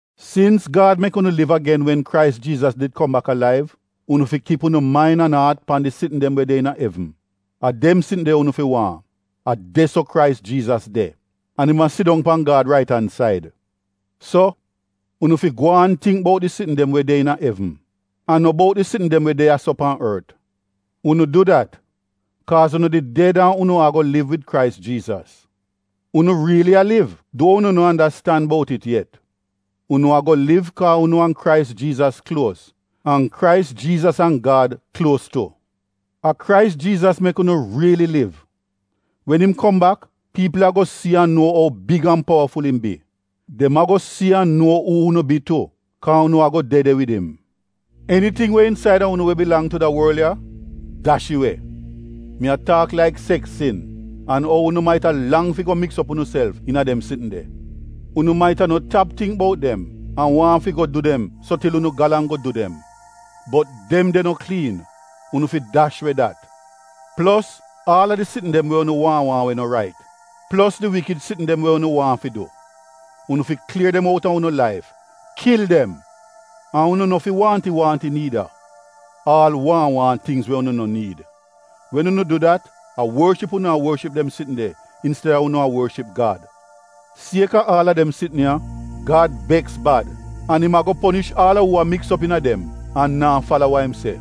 Sins Gad mek unu liv agen wen Krais Jiizas did kom bak alaiv, unu fi kip unu main an aat pan di sitn dem we de iina evn. A dem sitn de unu fi waahn. A de-so Krais Jiizas de. An im a sidong pan Gad rait an said. So, unu fi gwaan tingk bout di sitn dem we de iina evn, an no bout di sitn dem we de ya-so pan ort. Unu du dat, kaaz unu did ded an unu ago liv wid Krais Jiizas. Unu riili a liv, duo unu no andastan bout it yet. Unu ago liv kaa unu an Krais Jiizas kluos an Krais Jiizas an Gad kluos tu. A Krais Jiizas mek unu riili liv. Wen im kom bak piipl ago si an nuo ou big an powaful im bi. Dem ago si an nuo uu unu bi tu, kaa unu ago de de wid im. Eniting we insaida unu we bilang tu da worl ya — dash it we! Mi a taak laik seks sin, an ou unu maita lang fi go miks op unuself iina dem sitn de. Unu maita no tap tingk bout dem, an waahn fi go du dem so til unu galang go du dem. Bot dem de no kliin. Unu fi dash we dat! Plos aal a di sitn dem we unu waahn waahn we no rait; plos di wikid sitn dem we unu waahn fi du. Unu fi klier dem out a unu laif! Kil dem! An unu no fi waahnti-waahnti niida; aal waahn waahn tingz we unu no niid! Wen unu du dat, a worship unu a worship dem sitn de insteda unu a worship Gad. Sieka aal a dem sitn ya, Gad beks bad an im ago ponish aal a uu a miks op iina dem an naa fala wa im se.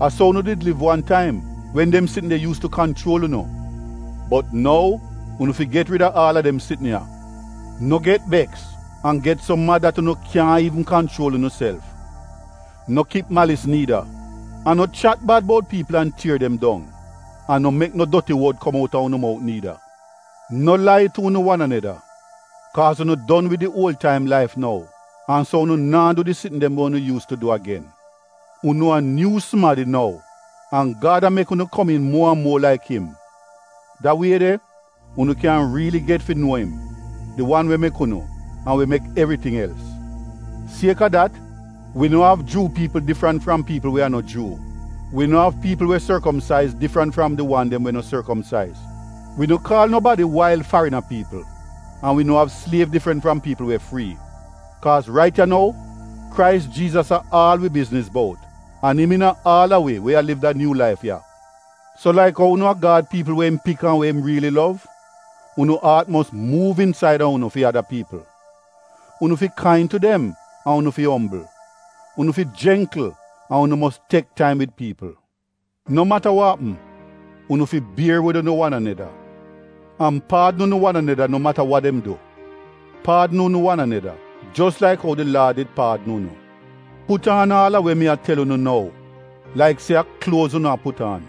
A so unu did liv wan taim, wen dem sitn de yuus tu kanchuol unu. Bot nou, unu fi get rid a aal a dem sitn ya: No get beks an get so mad dat unu kyaahn iivn kanchuol unuself. No kip malis niida, an no chat bad bout piipl an tier dem dong. An no mek no doti wod kom outa unu mout niida. No lai tu unu wan aneda, kaaz unu don wid di uol-taim laif nou, an so unu naa du di sitn dem we unu yuus tu du agen. Unu a nyuu sumadi nou. An Gad a mek unu komiin muo an muo laik im. Da wie de unu kyan riili get fi nuo im — di wan we mek unu, an we mek evriting els. Sieka dat, wi no av Juu piipl difrant fram piipl we a no Juu. Wi no av piipl we sorkomsaiz difrant fram di wan dem we no sorkomsaiz. Wi no kaal nobadi wail, farina piipl, an wi no av sliev difrant fram piipl we frii. Kaaz rait ya nou, Krais Jiizas a aal wi bizniz bout, an im iina aal a wi we a liv da nyuu laif ya. So laik ou unu a Gad piipl we im pik an we im riili lov, unu aat mos muuv insaida unu fi ada piipl. Unu fi kain tu dem an unu fi ombl. Unu fi jengkl an unu mos tek taim wid piipl. No mata wa apm, unu fi bier wid unu wan aneda, an paadn unu wan aneda no mata wa dem du. Paadn unu wan aneda, jos laik ou di Laad did paadn unu. Put aan aal a we mi a tel unu nou, laik se a kluoz unu a put aan.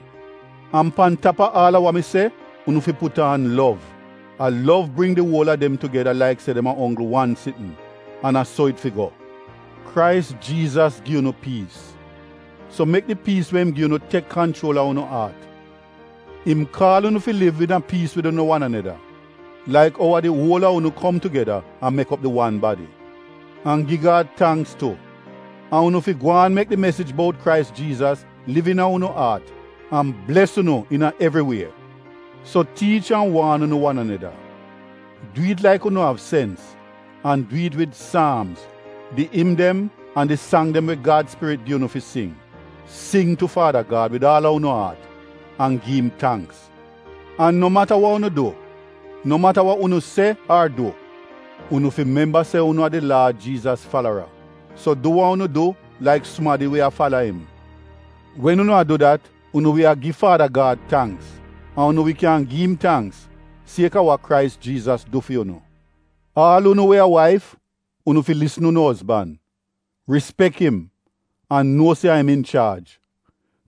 An pan tap a aal a wa mi se, unu fi put aan lov. A lov bring di uol a dem tugeda laik se dem a onggl wan sitn — an a so it fi go. Krais Jiizas gi unu piis. So mek di piis we im gi unu tek kanchuol a unu aat. Im kaal unu fi kom liv iina piis wid unu wan aneda laik ou a di uol a unu kom tugeda an mek op di wan badi. An gi Gad tangks tu. An unu fi gwaan mek di mesij bout Krais Jiizas liv iina unu aat an bles unu iina evri wie. So tiich an waan unu wan aneda. Du it laik unu av sens, an du it wid Saamz, di im dem an di sang dem we Gad spirit gi unu fi sing. Sing tu Faada Gad wid aal a unu aat an gi im tangks. An no mata wa unu du: no mata wa unu se ar du, unu fi memba se unu a di Laad Jiizas falara, so du wa unu du laik sumadi we a fala im. Wen unu a du dat, unu wi a gi Faada Gad tangks. An unu wi kyan gi im tangks, sieka wa Krais Jiizas du fi unu. Aal unu we a waif, unu fi lisn unu ozban, rispek im an nuo se a im inchaaj,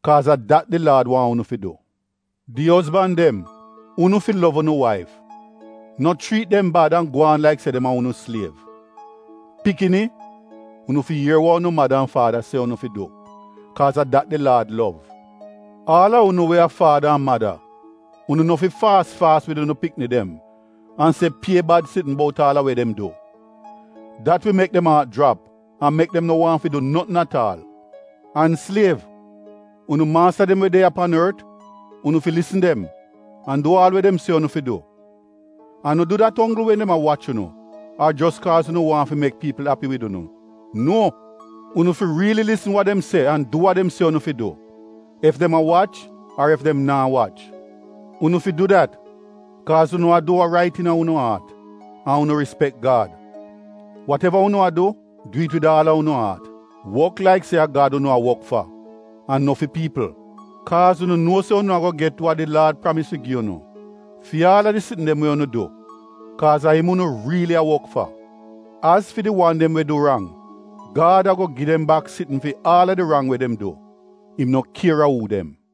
kaaz a dat di Laad waahn unu fi du. Di ozban dem, unu fi lov unu waif; no chriit dem bad an gwaan laik se dem a unu sliev. Pikini, unu fi ier wa unu mada an faada se unu fi du, kaaz a dat di Laad lov. Aal a unu we a faada an mada, unu no fi faas faas wid unu pikni dem an se pie bad sitn bout aal a we dem du. Dat wi mek dem aat jrap an mek dem no waahn fi du notn at aal. An sliev, unu maasta dem we de ya pan ort, unu fi lisn dem an du aal we dem se unu fi du. An no du dat onggl wen dem a wach unu ar jos kaaz unu waahn fi mek piipl api wid unu. Nuo! Unu fi riili lisn wa dem se an du wa dem se unu fi du ef dem a wach ar ef dem naa wach. Unu fi du dat kaaz unu a du wa rait iina unu aat an unu rispek Gad. Wateva unu a du, du it wid aal a unu aat; wok laik se a Gad unu a wok fa an no fi piipl. Kaaz unu nuo se unu ago get wa di Laad pramis fi gi unu fi aal a di sitn dem we unu du. Kaaz a im unu riili a wok fa. Az fi di wan dem we du di rang, Gad ago gi dem bak sitn fi aal a di rang we dem du. Im no kier a uu dem.